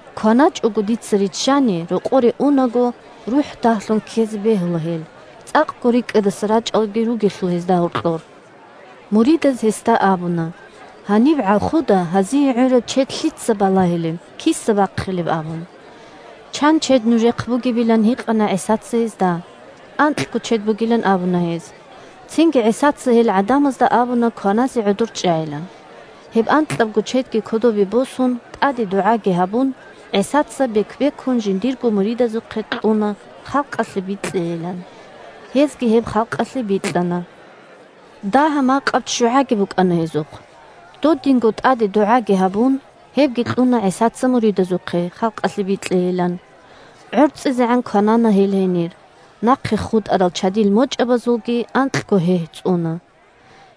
КваначӀого дица риччани, рокъоре унаго, рухӀ дагьлъун ккезе бегьула гьел, цӀакъго рикӀкӀадаса рачӀаралги ругелъул гьезда гьоркьор. Муридаз гьесда абуна: – Гьаниб гӀалхуда гьазие гӀураб чед лъица балагьилеб, киса бахъилеб? – абун. Чан чед нужехъ бугебилан гьикъана ГӀисаца гьезда. Анкьго чед бугилан абуна гьез. Цинги ГӀисаца гьел гӀадамазда абуна кваназе гӀодор чӀайилан. Гьеб анкьабго чедги кодобе босун, тӀаде дугӀаги гьабун, ГӀисаца бек-бекун жиндирго муридазухъе кьуна, халкъалъе бикьейилан. Гьезги гьеб халкъалъе бикьана. Дагьа-макъаб ччугӀаги букӀана гьезухъ. Додинго тӀаде дугӀаги гьабун, гьебги кьуна ГӀисаца муридазухъе, халкъалъе бикьеян. ГӀорцӀизегӀан кванана гьел гьенир; нахъе хутӀарал чадил мочӀабазулги анкьго гьегь цӀуна.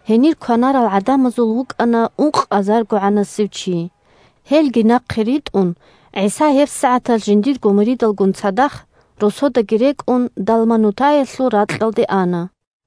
Гьенир кванарал гӀадамазул вукӀана ункъазаргогӀанасев чи. Гьелги нахъе ритӀун, ГӀиса гьебсагӀаталъ жиндирго муридалгун цадахъ, росодаги рекӀун, Далманутаялъул ракьалде ана.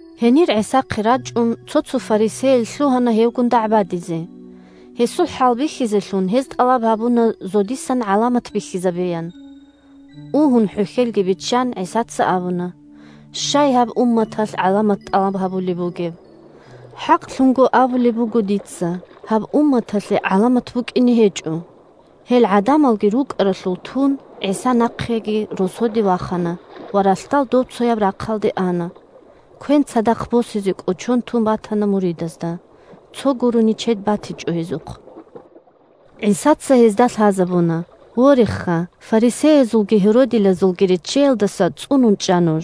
Гьенир ГӀисахъе рачӀун, цо-цо фарисеял лъугьана гьевгун дагӀбадизе. Гьесул хӀалбихьизелъун, гьез тӀалаб гьабуна зодисан гӀаламат бихьизабеян. Угьун хӀухьелги биччан, ГӀисаца абуна: – Щай гьаб умматалъ гӀаламат тӀалаб гьабулеб? ХӀакълъун абулеб буго дица: гьаб умматалъе гӀаламат букӀине гьечӀо. Гьел гӀадамалги рукӀаралъур тун, ГӀиса нахъеги росоде вахана ва ралъдал добцояб рахъалде ана. Квен цадахъ босизе кӀочон тун батана муридазда; цо гурони чед батичӀо гьезухъ. ГӀисаца гьезда лъазабуна: – Вореха, фарисеязулги гьеродилазулги реччеялдаса цӀунун чӀа нуж.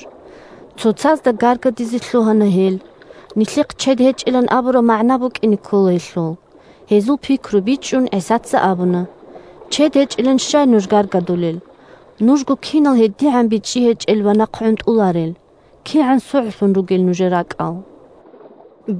Цоцазда гаргадизе лъугьана гьел: – Нилъехъ чед гьечӀилан абураб магӀна букӀине ккола гьелъул. Гьезул пикру бичӀчӀун, ГӀисаца абуна: – Чед гьечӀилан щай нуж гаргадулел? Нужго кинал гьедигӀан бичӀчӀи гьечӀел ва нахъгӀунтӀуларел? КигӀан согӀлъун нужер ракӀал ругел?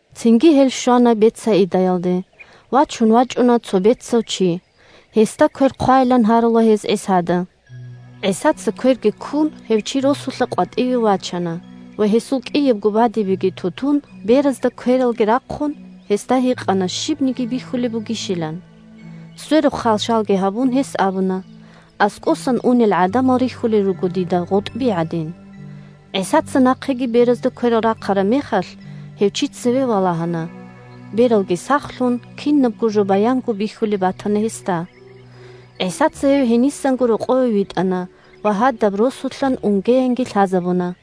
Цинги гьел щвана Бетсаидаялде. Вачун вачӀуна цо бецав чи. Гьесда квер хъвайилан гьарула гьез ГӀисада. ГӀисаца кверги ккун гьев чи росулъа къватӀиве вачана ва гьесул кӀиябго бадибеги ту-тун, беразда квералги рахъун, гьесда гьикъана щибниги бихьулеб бугищилан. Сверухъ хал-шалги гьабун, гьес абуна: – АскӀосан унел гӀадамал рихьулел руго дида гъутӀби гӀадин. ГӀисаца нахъеги беразда кверал рахъараб мехалъ, гьев чи цеве валагьана, – бералги сахлъун, кинабго жо баянго бихьулеб батана гьесда. ГӀисаца гьев гьенисанго рокъове витӀана ва гьадаб росулъан унгеянги лъазабуна.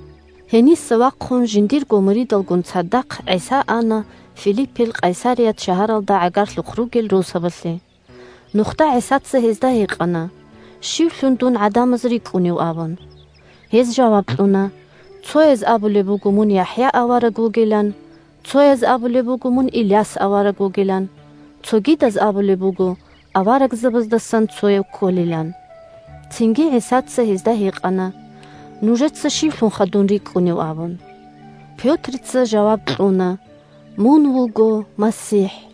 Гьениса вахъун жиндирго муридалгун цадахъ ГӀиса ана Филиппил Къайсарият шагьаралда гӀагарлъухъ ругел росабалъе. Нухда ГӀисаца гьезда гьикъана: – Щивлъун дун гӀадамаз рикӀкӀунев? – абун. Гьез жаваб кьуна: – Цояз абулеб буго мун ЯхӀя авараг вугилан, цояз абулеб буго Иляс авараг вугилан. Цогидаз абулеб буго аварагзабаздасан цояв кколилан. Цинги ГӀисаца гьезда гьикъана: – Нужеца щивлъунха дун рикӀкӀунев? – абун. Пётрица жаваб кьуна: – Мун вуго МасихӀ.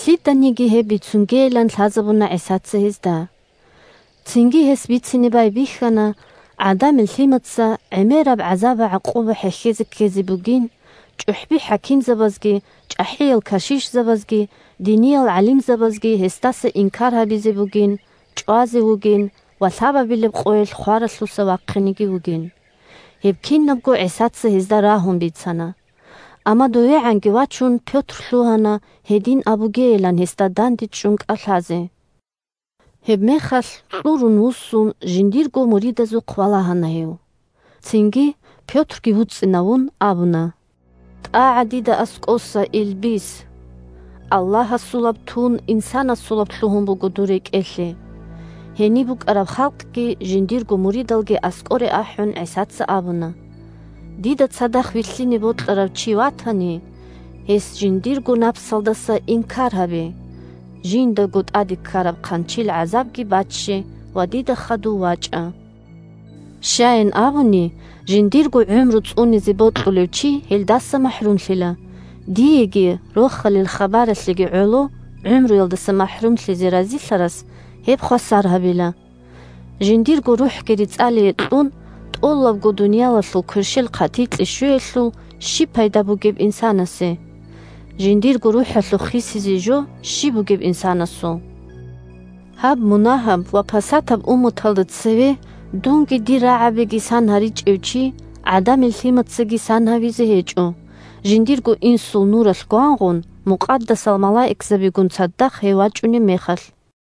Лъиданиги гьеб бицунгейилан лъазабуна ГӀисаца гьезда. Цинги гьес бицине байбихьана ГӀадамил Лъимаца гӀемераб гӀазаб-гӀакъуба хӀехьезе ккезе бугин, чӀухӀби-хӀакимзабазги, чӀахӀиял кашишзабазги, диниял гӀалимзабазги гьесдаса инкар гьабизе бугин, чӀвазе вугин ва лъабабилеб къоялъ хваралъуса вахъинеги вугин. Гьеб кинабго ГӀисаца гьезда рагьун бицана. Амма довегӀанги вачун Пётр лъугьана гьедин абугейилан гьесда дандечӀун кӀалъазе. Гьебмехалъ, кьурун вуссун, жиндирго муридазухъ валагьана гьев. Цинги, Пётрги вуцӀцӀинавун, абуна: – ТӀагӀа дида аскӀоса, Илбис! Аллагьасулаб тун, инсанасулаб лъугьун буго дур рекӀелъе. Гьениб букӀараб халкъги жиндирго муридалги аскӀоре ахӀун, ГӀисаца абуна: – Дида цадахъ вилълъине бокьарав чи ватани, гьес жиндирго напсалдаса инкар гьабе, жиндаго тӀаде ккараб хъанчил гӀазабги бачче ва дида хадув вачӀа. Щаян абуни, жиндирго гӀумру цӀунизе бокьулев чи гьелдаса махӀрумлъила, диеги Рохалил хабаралъеги гӀоло гӀумруялдаса махӀрумлъизе разилъарас гьеб хвасар гьабила. Жиндирго рухӀги рецӀалие кьун, тӀолабго дуниялалъул кверщел хъатикье щвеялъул щиб пайда бугеб инсанасе? Жиндирго рухӀалъухъ хисизе жо щиб бугеб инсанасул? Гьаб мунагьаб ва пасатаб умматалда цеве дунги дир рагӀабиги сан гьаричӀев чи ГӀадамил Лъимацаги сан гьавизе гьечӀо, жиндирго Инсул нуралъ гвангъун, мукъадасал малаикзабигун цадахъ гьев вачӀунеб мехалъ.